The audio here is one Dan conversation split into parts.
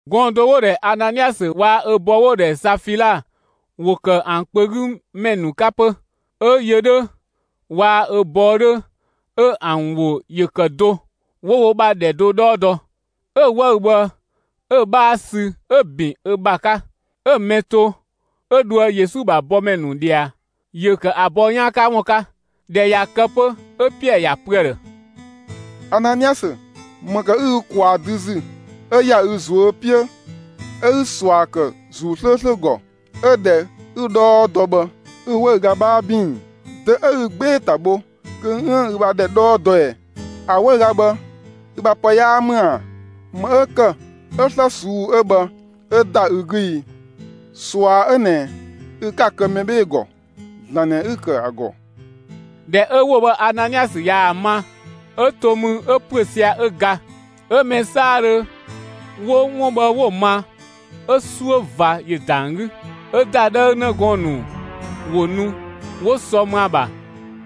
Gɔɔn‑ do 'wo‑ ‑dhɛ Ananiasö waa‑ ö bɔɔ 'wo‑ ‑dhɛ Safila ‑wo ‑kë ‑an kpö 'gü ‑mɛ ‑nu 'ka 'pö. 'Ö yö 'dhö waa‑ ö bɔɔ 'dhö 'ö ‑an ‑wo ‑yö ‑kë do, 'wo wo ‑bha ‑dhɛ do 'dhɔɔ dɔ. 'Ö‑ 'wëü‑ bhë 'ö‑ 'bhaa sü 'ö‑ ‑bin ö ‑bha 'ka, 'ö‑ mɛ to, 'ö dhoë Yesu ‑bha bɔmɛ ‑nu ꞊dhia; ‑yö ‑kë ‑a bɔɔ 'yaan 'ka ‑wun 'ka. ꞊Dhɛ ꞊ya kë 'pö 'ö Piɛɛ ‑ya pö ‑a ‑dhë: «Ananiasö, ‑më ‑kë 'ü ü ‑kwaa dü ‑zü 'ö ‑ya ü ꞊zuö' 'piö 'ö 'ü ꞊sua ‑kë ‑Zuu 'slööslö ‑gɔ, 'ö ‑dhɛ 'ü‑ 'dhɔɔ dɔ bhë 'ü‑ 'wëüga 'bhaa ‑bin ‑i? Dö 'ö ü 'gbee‑ ‑ta bho kö 'üën‑ ü bha ‑dhɛ 'dhɔɔ dɔ ꞊ɛ? ‑A 'wëüga bhë, ü bha ‑pë 'yaa ‑mü ‑a? ‑Më 'ö ‑kë 'ö 'slë ꞊suu'‑ 'ö bhë 'ö ‑da ü 'gü i? ꞊Sua 'ö ꞊nɛ ü 'ka‑ kë mɛ 'bhee‑ ‑gɔ, ‑Zlan ꞊nɛ 'ü‑ ‑kë ‑a ‑gɔ.» ꞊Dhɛ 'ö ‑wo bhë Ananiasö ꞊yaa‑ ma, 'ö to mü 'ö ‑püö sia‑ 'ö ga. 'Ö mɛ 'saadhö 'wo 'wun bhë 'wo‑ ma, 'ö 'suö ꞊va ‑yö ‑da ‑an 'gü. 'Ö ‑dadhëü 'në gɔɔn‑ ‑nu ‑wo nu 'wo sɔ më ‑a ‑bha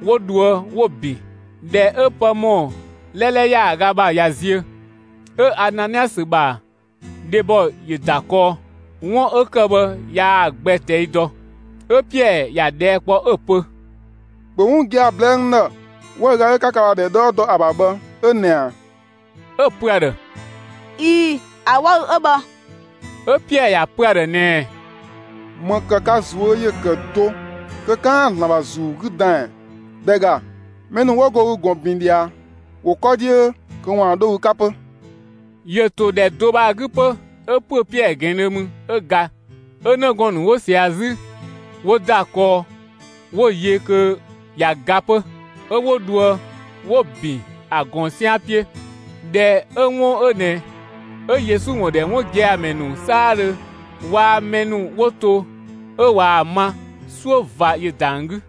'wo dhoë 'wo‑ ‑bin. ꞊Dhɛ 'ö pë ‑mɔ 'lɛlɛ ‑yaaga ‑bha ꞊ya ziö, 'ö Ananiasö ‑bha dhebɔ ‑yö ‑da kɔɔ. 'Wun 'ö ‑kë bhë yaa‑ gbɛ ꞊tɛi' dɔ. 'Ö Piɛɛ ‑ya ꞊dhɛɛ' kpɔ 'ö‑ pö: «‑Bhö 'wun gia‑ ꞊blɛɛ'‑ n ‑dhë! 'Wëüga 'ö 'ka ka ‑bha ‑dhɛ 'dhɔɔ dɔ ‑a ‑bha bhë 'ö ꞊nɛ ꞊a?» 'Ö‑ pö ‑a ‑dhë: «꞊Ii‑, ‑a 'wëü‑ 'ö bhë.» 'Ö Piɛɛ ‑ya pö ‑a ‑dhë ꞊nɛɛ: «‑Më ‑kë ka ꞊zuö' ‑yö ‑kë do kö 'kaan‑ ‑Zlan ‑bha ‑Zuu 'gü dan ꞊ɛ? ‑Dhɛ ‑ga, mɛ ‑nu 'wo go ü ꞊gɔn ‑bin ꞊dhia, ‑wo 'kɔ 'dhiö kö ‑waan 'dho ü 'ka 'pö.» ‑Yö ‑to ‑dhɛ do bhë ‑a 'gü 'pö, 'ö ‑püö Piɛɛ ꞊gɛɛndhö mü, 'ö ga. 'Ö 'në gɔɔn‑ ‑nu 'wo ꞊sia 'zü, 'wo ‑da kɔɔ 'wo‑ yö kö ꞊ya ga 'pö; 'ö 'wo dhoë 'wo‑ ‑bin ‑a ꞊gɔn 'sian 'piö. ꞊Dhɛ 'ö 'wun 'ö ꞊nɛ 'ö Yesu ‑wun ‑dhɛ 'wun gia‑ ‑mɛ ‑nu 'saadhö waa‑ mɛ ‑nu 'wo to 'ö ꞊waa‑ ma, 'suö ꞊va ‑yö ‑da ‑an 'gü.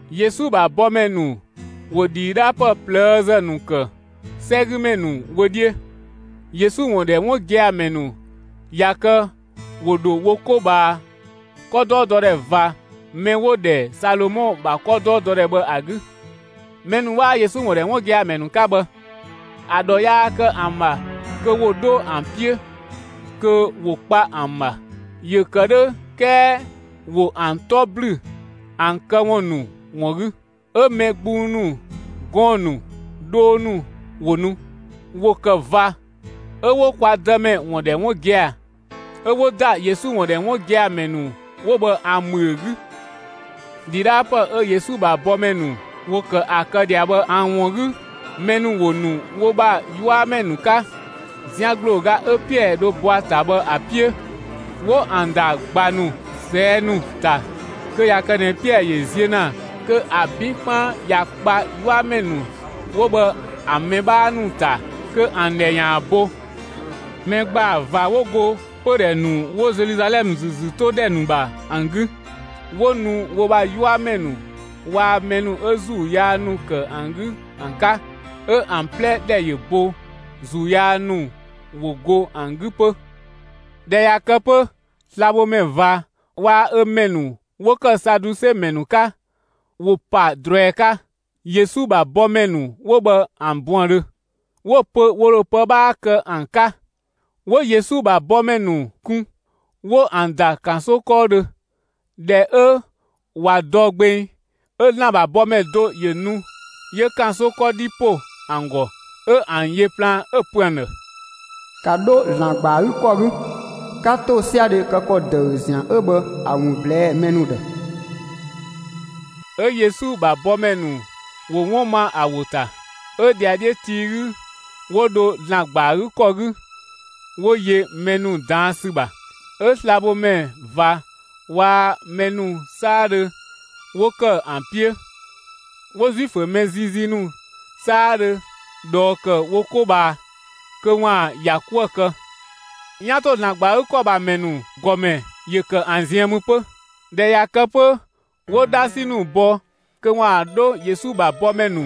Yesu ‑bha bɔmɛ ‑nu ‑wo ‑dhidhaapë ꞊plëëzë ‑nu ‑kë 'sɛgümɛ ‑nu wö 'dhiö. Yesu ‑wun ‑dhɛ 'wun gia‑ ‑mɛ ‑nu ꞊ya kë ‑wo ‑dho wo 'ko ꞊bhaa 'kɔdɔɔdɔdhɛ ꞊va mɛ 'wo‑ ‑dhɛ Salomɔ ‑bha 'kɔdɔɔdɔdhɛ bhë ‑a 'gü. Mɛ ‑nu 'waa Yesu ‑wun ‑dhɛ 'wun gia‑ ‑mɛ ‑nu 'ka bhë, ‑a ‑dhɔ 'yaa kë ‑an ‑bha kö ‑wo 'dho ‑an 'piö, kö 'wo kpa ‑an ‑bha. ‑Yö ‑kë 'dhö 'kɛɛ ‑wo ‑an 'tɔ ‑blü ‑an këwun ‑nu ‑wun 'gü. 'Ö mɛ gbung ‑nu, gɔɔn‑ ‑nu, dhoo ‑nu ‑wo nu; ‑wo kë ꞊va 'ö 'wo kwa Dëmɛ ‑wun ‑dhɛ 'wun gia‑, 'ö 'wo ‑da Yesu ‑wun ‑dhɛ 'wun gia‑ ‑mɛ ‑nu 'wo bhë ‑an ‑bhüö 'gü. ‑Dhidhaapë 'ö Yesu ‑bha bɔmɛ ‑nu ‑wo ‑kë ‑a kë ꞊dhia bhë ‑an ‑wun 'gü mɛ ‑nu ‑wo nu wo ‑bha 'yuamɛ ‑nu 'ka, zian ‑gblooga 'ö Piɛɛ dho bɔ ‑a ‑ta bhë ‑a 'piö, 'wo ‑an ‑da ꞊gba ‑nu, ꞊sɛɛ' ‑nu ‑ta kö ꞊ya kë ꞊nɛ Piɛɛ ‑yö ziö ‑na kö ‑a 'bin 'kpaan ‑ya kpa 'yuamɛ ‑nu 'wo bhë ‑an mɛ 'bhaa ‑nu ‑ta kö ‑an ‑dhɛ ‑yaan bo. Mɛ ‑gbaa ꞊va 'wo go 'pö pödhɛ ‑nu 'wo Zeluzalɛmë ‑zü ‑zü 'to ‑dhɛ ‑nu ‑bha ‑an 'gü, 'wo nu wo ‑bha 'yuamɛ ‑nu waa‑ mɛ ‑nu 'ö ‑zuu yaa ‑nu ‑kë ‑an 'gü ‑an 'ka, 'ö ‑an 'plɛ ‑dhɛ ‑yö bo; ‑zuu yaa ‑nu ‑wo ‑go ‑an 'gü 'pö. ꞊Dhɛ ꞊ya kë 'pö slabhomɛ ꞊va waa‑ ö mɛ ‑nu 'wo ‑kë Saduse ‑mɛ ‑nu 'ka, ‑wo pa ꞊druɛi 'ka Yesu ‑bha bɔmɛ ‑nu 'wo bhë ‑an buëndhö. 'Wo‑ pö ‑wo ‑dho pë 'bhaa kë ‑an 'ka; 'wo Yesu ‑bha bɔmɛ ‑nu kun, 'wo ‑an ‑da ‑kanso 'kɔɔdhö. ꞊Dhɛ 'ö ꞊wa dɔ gbeng, 'ö ‑Zlan ‑bha bɔmɛ do ‑yö nu 'yö ‑kanso 'kɔdhi ‑po ‑an ‑gɔ, 'ö ‑an yö plaan, 'ö‑ pö ‑an ‑dhë: «‑Ka 'dho ‑Zlan ‑gba ‑a 'gü ‑kɔ 'gü, 'ka ‑tosiadhe kë ‑kɔ ‑dëü ‑zian 'ö bhë ‑a ‑wun ꞊blɛɛ'‑ mɛ ‑nu ‑dhë!» 'Ö Yesu ‑bha bɔmɛ ‑nu ‑wo 'wun ma ‑a ‑wo ‑ta. 'Ö ‑dhiadhiö tii 'gü 'wo dho ‑Zlan ‑gba ‑a 'gü ‑kɔ 'gü 'wo yö mɛ ‑nu ꞊daan' ‑sü ‑bha. 'Ö slabhomɛ ꞊va waa‑ mɛ ‑nu 'saadhö 'wo ‑kë ‑a 'piö, 'wo Zuifö mɛ ziizii ‑nu 'saadhö ꞊dhɔɔ ‑kë wo 'ko ꞊bhaa kö ‑waan ‑ya 'kuë‑ kë. ('Yan ‑to ‑Zlan ‑gba ‑a 'gü ‑kɔ ‑bha ‑mɛ ‑nu ‑gɔmɛ ‑yö ‑kë ‑an ziën mü 'pö.) ꞊Dhɛ ꞊ya ‑kë 'pö, 'wo 'dhasi ‑nu bɔ kö ‑waan 'dho Yesu ‑bha bɔmɛ ‑nu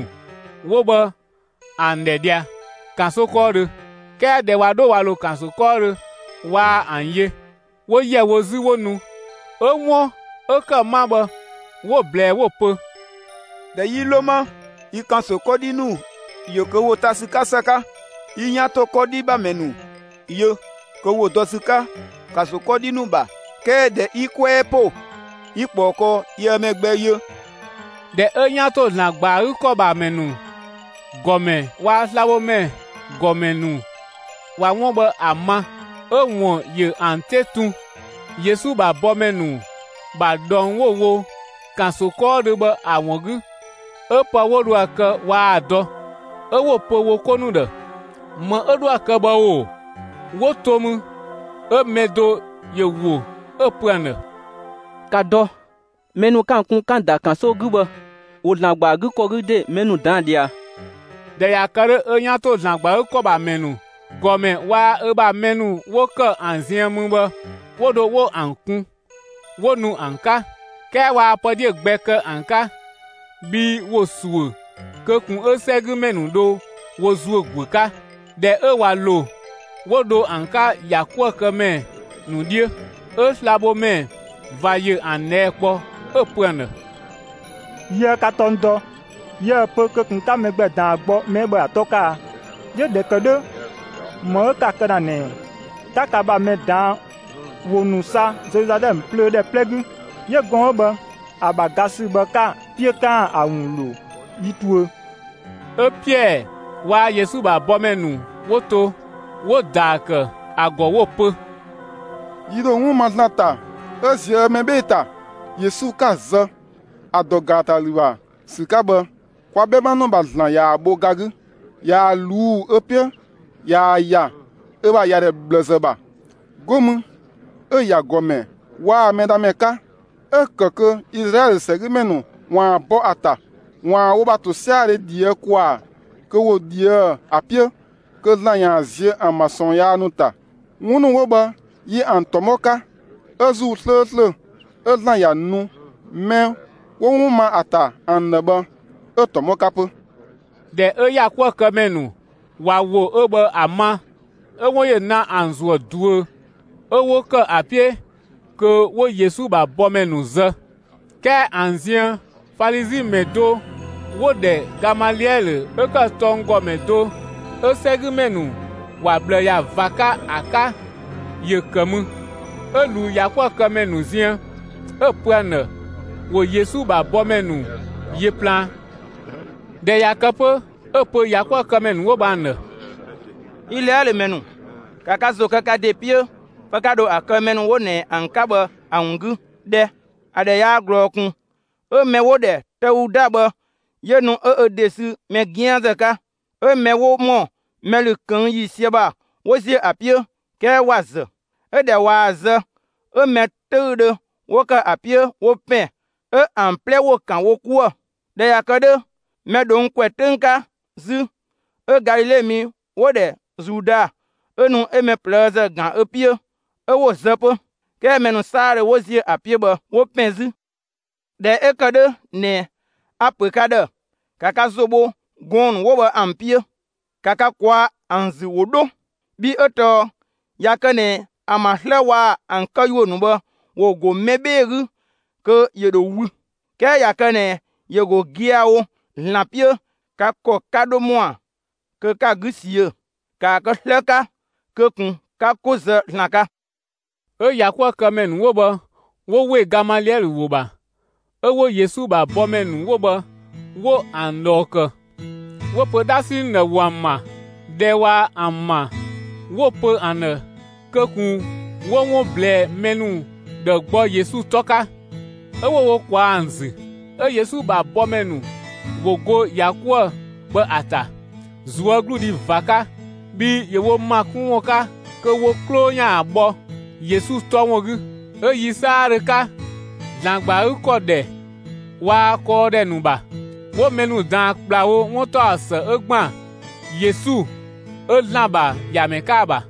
'wo bhë ‑an ‑dhɛ ꞊dhia ‑kanso 'kɔɔdhö. 'Kɛɛ ꞊dhɛ ꞊wa 'dho ꞊wa ‑lo ‑kanso 'kɔɔdhö, waa ‑an yö. 'Wo ‑yɛ wo 'zü 'wo nu, 'ö 'wun 'ö ‑kë 'ma bhë 'wo‑ ꞊blɛɛ, 'wo‑ pö: «꞊Dhɛ 'yi ‑lo 'ma, yi ‑kanso 'kɔdhi ‑nu ‑yö kö ‑wo ta ‑sü 'ka ‑së 'ka. 'Yi 'yan ‑to 'kɔdhi ‑bha ‑mɛ ‑nu yö kö ‑wo dɔ ‑sü 'ka ‑kanso 'kɔdhi ‑nu ‑bha. 'Kɛɛ ꞊dhɛ 'yi 'kwɛɛ ‑po 'yi ꞊kpɔɔ kɔɔ, yië mɛ gbɛ yö.» ꞊Dhɛ 'ö 'yan ‑to ‑Zlan ‑gba ‑a 'gü ‑kɔ ‑bha ‑mɛ ‑nu ‑gɔmɛ waa‑ slabhomɛ ‑gɔmɛ ‑nu ꞊wa 'wun bhë ‑a ma, 'ö‑ ‑wun ‑yö ‑an 'te tun, Yesu ‑bha bɔmɛ ‑nu ‑bha ꞊dhɔng 'wo‑ wo ‑kanso 'kɔɔdhö bhë ‑a ‑wun 'gü. 'Ö pë 'wo dho ‑a kë waa‑ dɔ. 'Ö 'wo‑ pö wo 'ko ‑nu ‑dhë: «‑Më 'ö 'dhoë‑ kë bhë ‑o?» ‑Wo ‑to mü, 'ö mɛ do ‑yö ‑wo, 'ö‑ pö ‑an ‑dhë: «‑Ka dɔ! Mɛ ‑nu 'ö 'ka ‑an kun, 'ka ‑an ‑da ‑kanso 'gü bhë, ‑wo ‑Zlan ‑gba ‑a 'gü ‑kɔ 'gü ‑de, mɛ ‑nu ꞊daan' ꞊dhia!» ꞊Dhɛ ꞊ya kë 'dhö, 'ö 'yan ‑to ‑Zlan ‑gba ‑a 'gü ‑kɔ ‑bha ‑mɛ ‑nu ‑gɔmɛ waa‑ ö bha mɛ ‑nu 'wo ‑kë ‑an ziën mü bhë 'wo dho 'wo ‑an kun, 'wo nu ‑an 'ka. 'Kɛɛ waa pë 'dhiö‑ gbɛ kë ‑an 'ka, bhii ‑wo ‑suö kö ꞊kun 'ö 'sɛgümɛ ‑nu dho wo ‑zuö ‑guö 'ka. ꞊Dhɛ 'ö ꞊wa ‑lo, 'wo dho ‑an 'ka ‑yakuëkëmɛ ‑nu 'dhiö. 'Ö slabhomɛ ꞊va ‑yö ‑an ꞊dhɛɛ' kpɔ, 'ö‑ pö ‑an ‑dhë: «Yiëë ka tɔng dɔ, yiëë‑ pö kö ꞊kun 'ka mɛ gbɛ ꞊daan gbɔ mɛ 'ö bhë ‑a 'tɔ 'ka a? 'Yö ꞊dhɛ ‑kë 'dhö, ‑më 'ö 'ka‑ kë ‑na ꞊nɛ ꞊ɛ? 'Ka ka ‑bha mɛ ꞊daan' ‑wo ‑nu sa Zeluzalɛmë plöö ‑dhɛ 'plɛ 'gü; 'yö gɔɔn‑ 'ö bhë ‑a ‑bha ga ‑sü bhë 'ka‑ 'piö kö 'kaan‑ ‑a ‑wun ‑lo yi tuö.» 'Ö Piɛɛ waa‑ Yesu ‑bha bɔmɛ ‑nu 'wo to, 'wo ‑daa ‑kë ‑a ‑gɔ 'wo‑ pö: «Yi ‑dho 'wun ma ‑Zlan ‑ta 'ö ꞊zië' mɛ 'bhee‑ ‑ta! Yesu 'ka‑ zë, ‑a ‑dɔ ‑gaatalü ‑bha ‑sü 'ka bhë, kwa 'bhɛma ‑nu ‑bha ‑Zlan ꞊yaa‑ bho ga 'gü, ꞊yaa‑ ꞊luu' ö 'piö ꞊yaa‑ ‑ya ö bha ‑yadhɛ ꞊bhlëzë ‑bha. 'Go mü 'ö‑ ‑ya ‑Gɔmɛ waa‑ Mɛdhamɛ 'ka, 'ö‑ ‑kë kö Izlaɛlö 'sɛgümɛ ‑nu ‑waan bɔ ‑a ‑ta ‑waan wo ‑bha ‑tosiadhe ꞊dhië' ‑kwaa kö ‑wo ꞊dhië'‑ ‑a 'piö kö ‑Zlan ‑yaan ziö ‑an ‑bha ꞊sɔɔn yaa ‑nu ‑ta. 'Wun ‑nu 'wo bhë yi ‑an ‑tɔmɔ 'ka. 'Ö ‑Zuu 'slööslö 'ö ‑Zlan ‑ya nu mɛ 'wo 'wun ma ‑a ‑ta ‑an ‑dhë bhë, 'ö‑ ‑tɔmɔ 'ka 'pö.» ꞊Dhɛ 'ö ‑yakuëkëmɛ ‑nu ꞊wa ‑wo 'ö bhë ‑a ma, 'ö 'wun ‑yö na ‑an ‑zuë ꞊duö, 'ö 'wo ‑kë ‑a 'piö kö 'wo Yesu ‑bha bɔmɛ ‑nu zë. 'Kɛɛ ‑an ziën, Falizi ‑mɛ do 'wo‑ ‑dhɛ Gamaliɛlö 'ö ‑kë tɔnggɔmɛ do 'ö 'sɛgümɛ ‑nu ‑wa ꞊bhlë ‑ya ꞊va 'ka ‑a 'ka, ‑yö ‑kë mü. 'Ö ꞊luu ‑yakuëkëmɛ ‑nu ziën, 'ö‑ pö ‑an ‑dhë ‑wo Yesu ‑bha bɔmɛ ‑nu yö plaan. ꞊Dhɛ ꞊ya kë 'pö, 'ö‑ pö ‑yakuëkëmɛ ‑nu 'wo bhë ‑an ‑dhë: «Izlaɛlö ‑mɛ ‑nu, ‑ka ka ‑zo kë ka ‑de 'piö, pë 'ka dho ‑a kë mɛ ‑nu 'wo ꞊nɛ ‑an 'ka bhë ‑a ‑wun 'gü 'dhɛ! ‑A ‑dhɛ yaa ꞊glɔɔ ꞊kun 'ö mɛ 'wo‑ ‑dhɛ Tëuda bhë, ‑yö nu 'ö ö ‑de sü mɛ 'gianzë 'ka. 'Ö mɛ 'wo ‑mɔ mɛ ‑lü ꞊këng' ‑yiisië ‑bha 'wo ‑ziö ‑a 'piö. 'Kɛɛ ‑wa ‑zë. 'Ö ꞊dhɛ ꞊waa‑ zë 'ö mɛ 'töüdhö 'wo ‑kë ‑a 'piö 'wo ‑pɛn 'ö ‑an 'plɛ ‑wo ‑kan wo 'kuë‑. ꞊Dhɛ ꞊ya kë 'dhö, mɛ ꞊dhong' ‑kwɛ 'töng 'ka 'zü, 'ö Galile mi 'wo‑ ‑dhɛ Zuda, 'ö nu 'ö mɛ ꞊plëëzë ‑gan ö 'piö, 'ö 'wo‑ zë 'pö; 'kɛɛ mɛ ‑nu 'saadhö 'wo ‑ziö ‑a 'piö bhë 'wo ‑pɛn 'zü. ꞊Dhɛ 'ö ‑kë 'dhö ꞊nɛ, a‑ ‑pö ka ‑dhë: ‑Ka ka ‑zo bho gɔɔn‑ ‑nu 'wo bhë ‑an 'piö, 'ka ka ꞊kwaa'‑ ‑an ‑zü, ‑wo 'dho! Bhii 'ö tɔɔ ꞊ya kë ꞊nɛ ‑an ‑bha 'slë waa‑ ‑an këyuö ‑nu bhë ‑wo ‑go mɛ 'bhee‑ 'gü, kö ‑yö ‑dho wü. 'Kɛɛ ꞊ya kë ꞊nɛ ‑yö ‑go gia‑ wo ‑Zlan 'piö, ka ‑kɔ 'ka 'dho ‑mɔa kö 'ka‑ 'gü ꞊siö'‑. ‑Kaa kë 'slë 'ka kö ꞊kun 'ka 'ko zë ‑Zlan 'ka!» 'Ö ‑yakuëkëmɛ ‑nu 'wo bhë 'wo ‑we Gamaliɛlö ‑wo ‑bha. 'Ö 'wo Yesu ‑bha bɔmɛ ‑nu 'wo bhë 'wo ‑an ꞊dhɔɔ ‑kë. 'Wo‑ pö 'dhasi ‑nu ‑dhë ‑wo ‑an ‑ma. ꞊Dhɛ ꞊wa ‑an ‑ma, 'wo‑ pö ‑an ‑dhë kö ꞊kun 'wo 'wun ꞊blɛɛ mɛ ‑nu ‑dhë gbɔ Yesu 'tɔ 'ka; 'ö 'wo wo ꞊kwaa ‑an ‑zü. 'Ö Yesu ‑bha bɔmɛ ‑nu ‑wo go ‑ya 'kuë‑ bhë ‑a ‑ta, ꞊zuögludhi ꞊va 'ka, bhii ‑yö wo ‑ma 'kun ‑wun 'ka kö wo 'klo ‑yaan bhɔ Yesu 'tɔ ‑wun 'gü. 'Ö yi 'saadhö 'ka, ‑Zlan ‑gba ‑a 'gü ‑kɔ ‑dhɛ waa‑ kɔɔdhɛ ‑nu ‑bha, 'wo mɛ ‑nu ꞊daan ‑kplawo 'wuntaɔsë 'ö ‑gban Yesu 'ö ‑Zlan ‑bha ‑Yamɛ 'ka ‑a ‑bha.